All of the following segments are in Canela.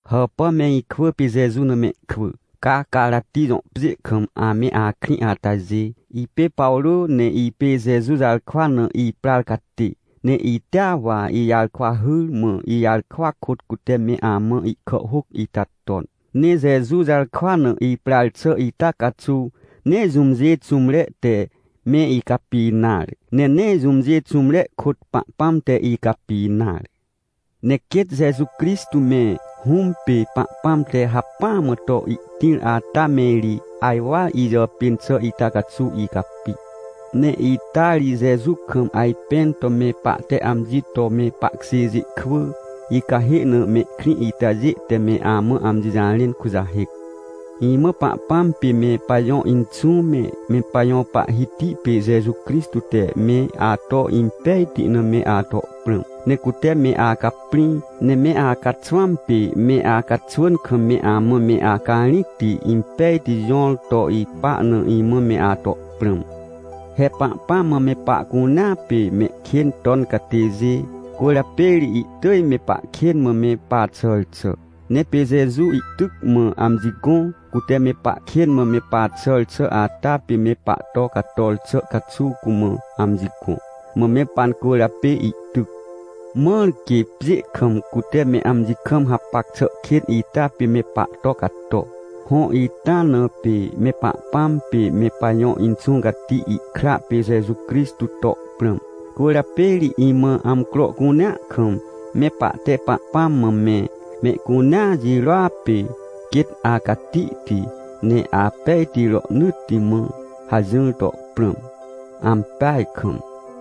Hàpà me ikwỳ pê Jeju na mehkwỳ, ca Carati jõ pjê kam ame akrĩ atajê. Ipê Pawrô, ne ipê Jeju jarkwa na iprar catê. Ne itea wa ijarkwa hyr, mã ijarkwa kôt cute me amã ihkàhhôc ita ton. Ne Jeju jarkwa na iprar xà ita caxuw nee jũmjê xũmre te me icapi nare, ne nee jũmjê xũmre kôt Pahpãm te icapi nare. Ne quêt Jeju Crixtô me, Hũm pê Pahpãm te hacpỹa mã to ihtĩr ata me ri ajwar ijàpên xà ita caxuw icapi. Ne ita ri Jeju kam ajpẽn to me pahte amji to me pahkjêjê kwỳ, icahê na mehkrĩ itajê te me amã amji jarẽn kujahêc. Imã Pahpãm pê me pajõ Inxũ me, me pajõ Pahhiti pê Jeju Crixtô te me ato impejti na me ato prãm. Ne cute me acaprĩ, ne me acaxwãm pê me acaxwỳn kam me amã me acarĩcti, impejti jõr to ipa na, imã me ato prãm. He Pahpãm mã me pahcunea pê mehkên ton catêjê, cwỳrjapê ri ihtỳj me pahkên mã me paxàr xà. Ne pê Jeju ihtyc mã amji gõ. Cute me pahkên mã me paxàr xà ata pê me pahto cator xà caxuw cumã amji gõ, mã me pancwỳrjapê ihtyc. Mãr quê pjê kam, cute me amji kam hapac xà kên ita pê me pahto cato. Hõ, ita na pê me Pahpãm pê me pajõ Inxũ Cati ihkra pê Jeju Crixtô to prãm. Cwỳrjapê ri imã amcro cunea kam me pahte Pahpãm mã me: — Mehcunea jirôa pê quêt acatihti, ne apejti rohnỳtti mã — hajỹr to prãm. Ampeaj kam!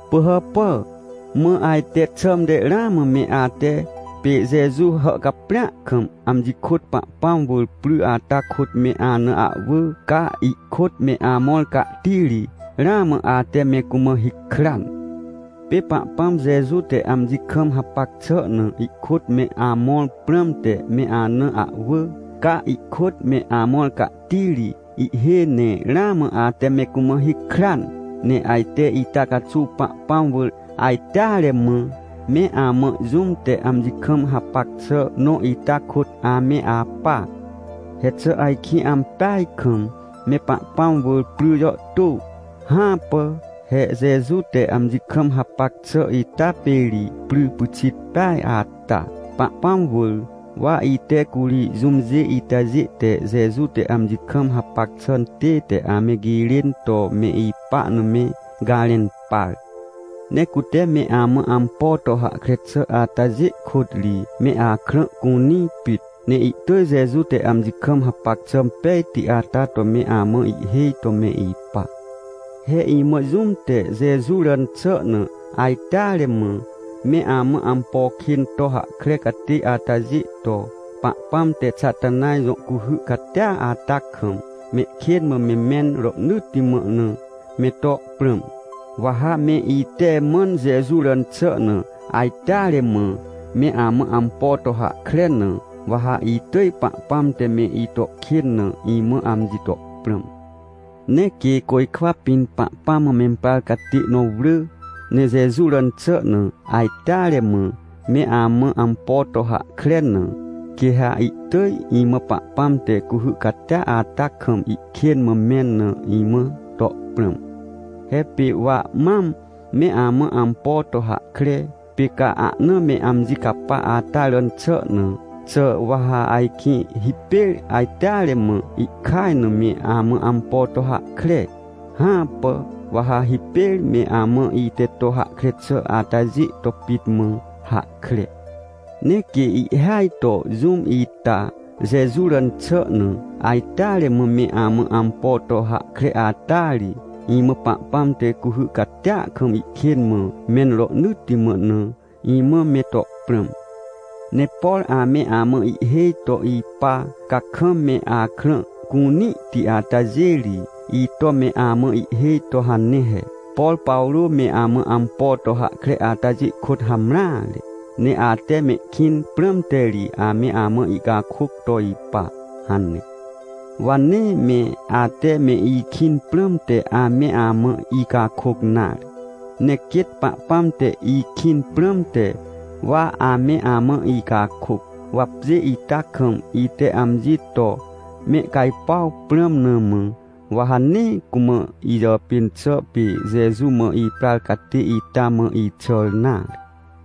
Pỳhàpà! Mã ajte xãmte ramã me ate, pê Jeju hàhcaprĩa kam amji kôt Pahpãm wỳr pry ata kôt me ana ahwỳ, ca ihkôt me amõr cahtiri, ramã ate me cumã hikran! Pê Pahpãm Jeju te amji kam hapac xà na ihkôt me amõr prãmte me ana ahwỳ, ca ihkôt me amõr cahtiri ihhêj ne ramã ate me cumã hikran! Ne ajte ita caxuw Pahpãm wỳr ajteare mã, me amã jũm te amji kam hapac xà nõ ita kôt ame apa. He xà ajkĩ ampeaj kam me Pahpãm wỳr pry jàhtô? Hãpà! He Jeju te amji kam hapac xà ita pê ri pry pyxit peaj ata, Pahpãm wỳr. Wa ite curi jũmjê itajê te Jeju te amji kam hapac xà tête ame girên to me ipa na me garẽn par. Ne cute me amã ampo to hahkre xà atajê kôt ri, me akrã cunĩ pit. Ne ihtỳj Jeju te amji kam hapac xà pejti ata to me amã ihhêj to me ipa. He imã jũm te Jeju ràn xà na ajteare mã me amã ampo kên to hahkre catê atajê to, Pahpãm te Xatanaj jõ cuhy catia ata kam, mehkên mã me mẽn rohnỳtti mã na, me to prãm. Wa ha me ite mãn Jeju ràn xà na ajteare mã me amã ampo to hahkre na, wa ha itỳj Pahpãm te me ito kên na, imã amji to prãm. Ne quê côjkwa pĩn Pahpãm mã memprar catê nõ wrỳ, ne Jeju ràn xà na, ajteare mã, me amã ampo to hahkre na, quê ha ihtỳj imã Pahpãm te cuhy catia ata kam ihkên mã mẽn na, imã to prãm. He pê wa mam me amã ampo to hahkre, pê ca ahna me amji capa ata ràn xà na, xà wa ha ajkĩ hipêr ajteare mã ihkaj na me amã ampo to hahkre? Hãpà, wa ha hipêr me amã ite to hahkre xà atajê to pit mã hahkre. Ne quê ihhêaj to jũm ita, Jeju ràn xà na, ajteare mã me amã ampo to hahkre ata ri, imã Pahpãm te cuhy catia kam ihkên mã mẽn rohnỳtti mã na, imã me to prãm. Ne por ame amã ihhêj to ipa, ca kam me akrã cunĩhti atajê ri, ito me amã ihhêj to hane he: — Por Pawrô me amã ampo to hahkre atajê kôt hamreare. Ne ate mehkĩn prãmte ri ame amã ihcakôc to ipa — hane. Wa nee me ate me ikĩn prãmte ame amã icakôc nare, ne quêt Pahpãm te ikĩn prãmte, wa ame amã icakôc. Wa pjê ita kam ite amji to mehcajpuaw prãm na mã, wa ha nee cumã ijàpên xà, pê Jeju mã iprar catê ita, mã ixàr nare.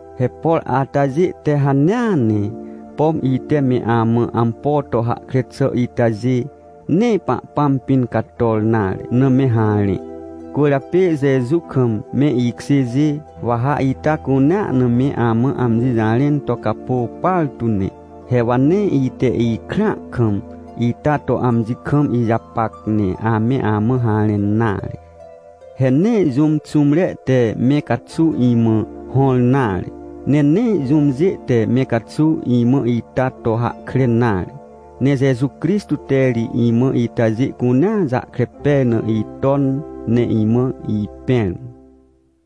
He por atajê te hanea ne, pom ite me amã ampo to hahkre xà itajê, nee Pahpãm pĩn cator nare na me harẽ. Cwỳrjapê Jeju kam me ikjêjê, wa ha ita cunea na me amã amji jarẽn to capô partu ne. He wa nee ite ikrãa kam ita to amji kam ijapac, ne ame amã harẽn nare. He nee jũm xũmre te me caxuw imã hõr nare, ne nee jũmjê te me caxuw imã ita to hahkre nare. Ne Jeju Crixtô te ri imã itajê cunea jahkre pej na iton, ne imã ipẽr.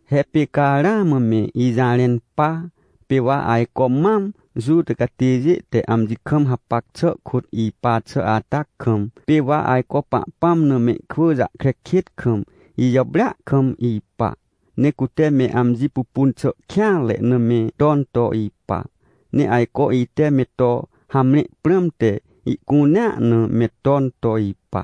He pê ca ramã me ijarẽn pa, pê wa ajco mam Juta catêjê te amji kam hapac xà kôt ipa xà ata kam, pê wa ajco Pahpãm na mehkwỳ jahkre kêt kam, ijàprêa kam ipa. Ne cute me amji pupun xà kêanre na me ton to ipa. Ne ajco ite me to hamre prãmte ihcunea na me ton to ipa.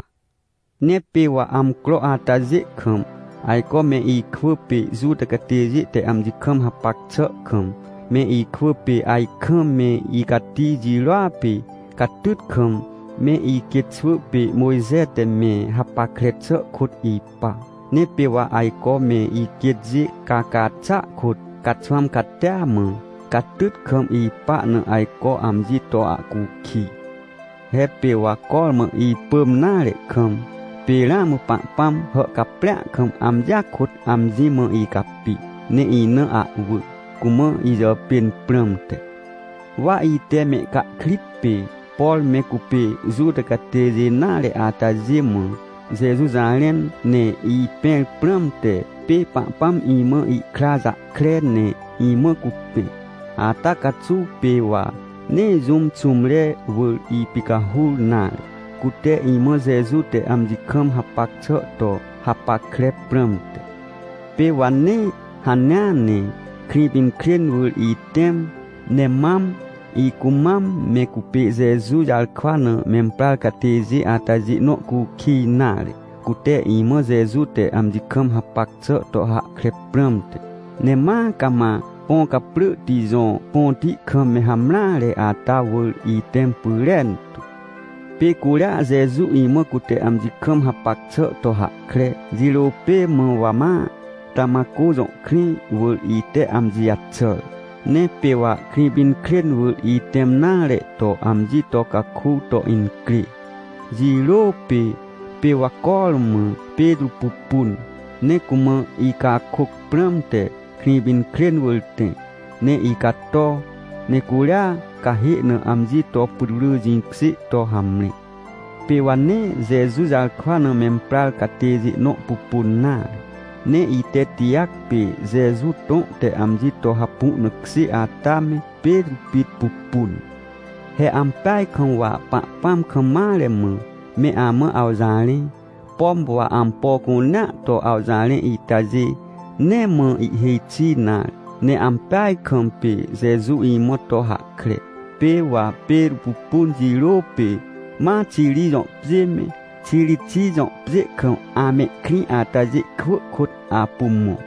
Ne pê wa amcro atajê kam, ajco me ikwỳ pê Juta catêjê te amji kam hapac xà kam, me ikwỳ pê ajkam me icati jirôa pê catyt kam, me iquêt xwỳ pê Mojxe te me hapackre xà kôt ipa. Ne pê wa ajco me iquêtjê caca xàa kôt, caxwãm catia mã, catyt kam ipa na ajco amji to ahcukij. He pê wa cormã ipỳm nare kam, pê ramã Pahpãm hàhcaprĩa kam amjia kôt amji mã icapi, ne ina ahwỳ, cumã ijàpên prãmte. Wa ite mehcahkrit pê, por me cupê Juta catêjê nare atajê mã, Jeju jarẽn, ne ipẽr prãmte, pê Pahpãm imã ikra jahkre ne imã cupẽ. Ata caxuw pê wa nee jũm xũmre wỳr ipicahur nare, cute imã Jeju te amji kam hapac xà to hapackre prãmte. Pê wa nee hanea ne Krĩpinkrên wỳr itẽm, ne mam, icumam me cupê Jeju jarkwa na memprar catêjê atajê nõ cukij nare, cute imã Jeju te amji kam hapac xà to hahkre prãmte. Ne ma cama Põcaprỳhti jõ põti kam me hamreare ata wỳr itẽm pyrentu. Pê curia Jeju imã cute amji kam hapac xà to hahkre, jirô pê mã wa ma, Tamatcô jõ krĩ wỳr ite amji jaxàr. Ne pê wa Krĩpinkrên wỳr itẽm nare to amji to caku to incrê, jirô pê, pê wa cormã Petrô pupun. Ne cumã icakôc prãmte Krĩpinkrên wỳr tẽ, ne icato, ne curia cahê na amji to putwrỳ jĩkjê to hamre. Pê wa nee Jeju jarkwa na memprar catêjê nõ pupun nare, ne ite Tijac pê Jeju tõ te amji to hapu na kjê ata me, Petrô pit pupun. He ampeaj kam wa Pahpãm kam mare mã, me amã awjarẽ, pom wa ampo cunea to awjarẽ itajê, nee mã ihêj xi nare, ne ampeaj kam pê Jeju imã to hahkre. Pê wa Petrô pupun jirô pê, ma Xiri jõ pjê me, Xirixij jõ pjê kam amehkrĩ atajê kwỳ kôt apu mõ.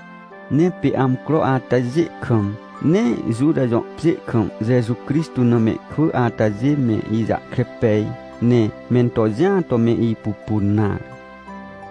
Ne pê amcro atajê kam, nee Juta jõ pjê kam Jeju Crixtô na mehkwỳ atajê me ijahkre pej, ne mento jĩa to me ipupun nare.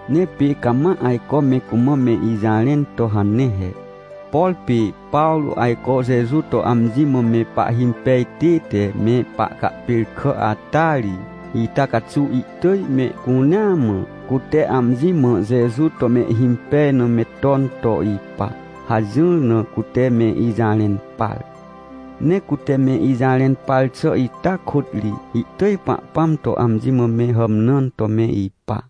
Ne pê cama ajco me cumã me ijarẽn to hane he: — Por pê Pawrô ajco Jeju to amji mã me pahhimpej tête me pahcahpêrkà ata ri, ita caxuw ihtỳj mehcunea mã, cute amji mã Jeju to mehhimpej na me ton to ipa — hajỹr na cute me ijarẽn par. Ne cute me ijarẽn par xà ita kôt ri, ihtỳj Pahpãm to amji mã me hàmnãn to me ipa.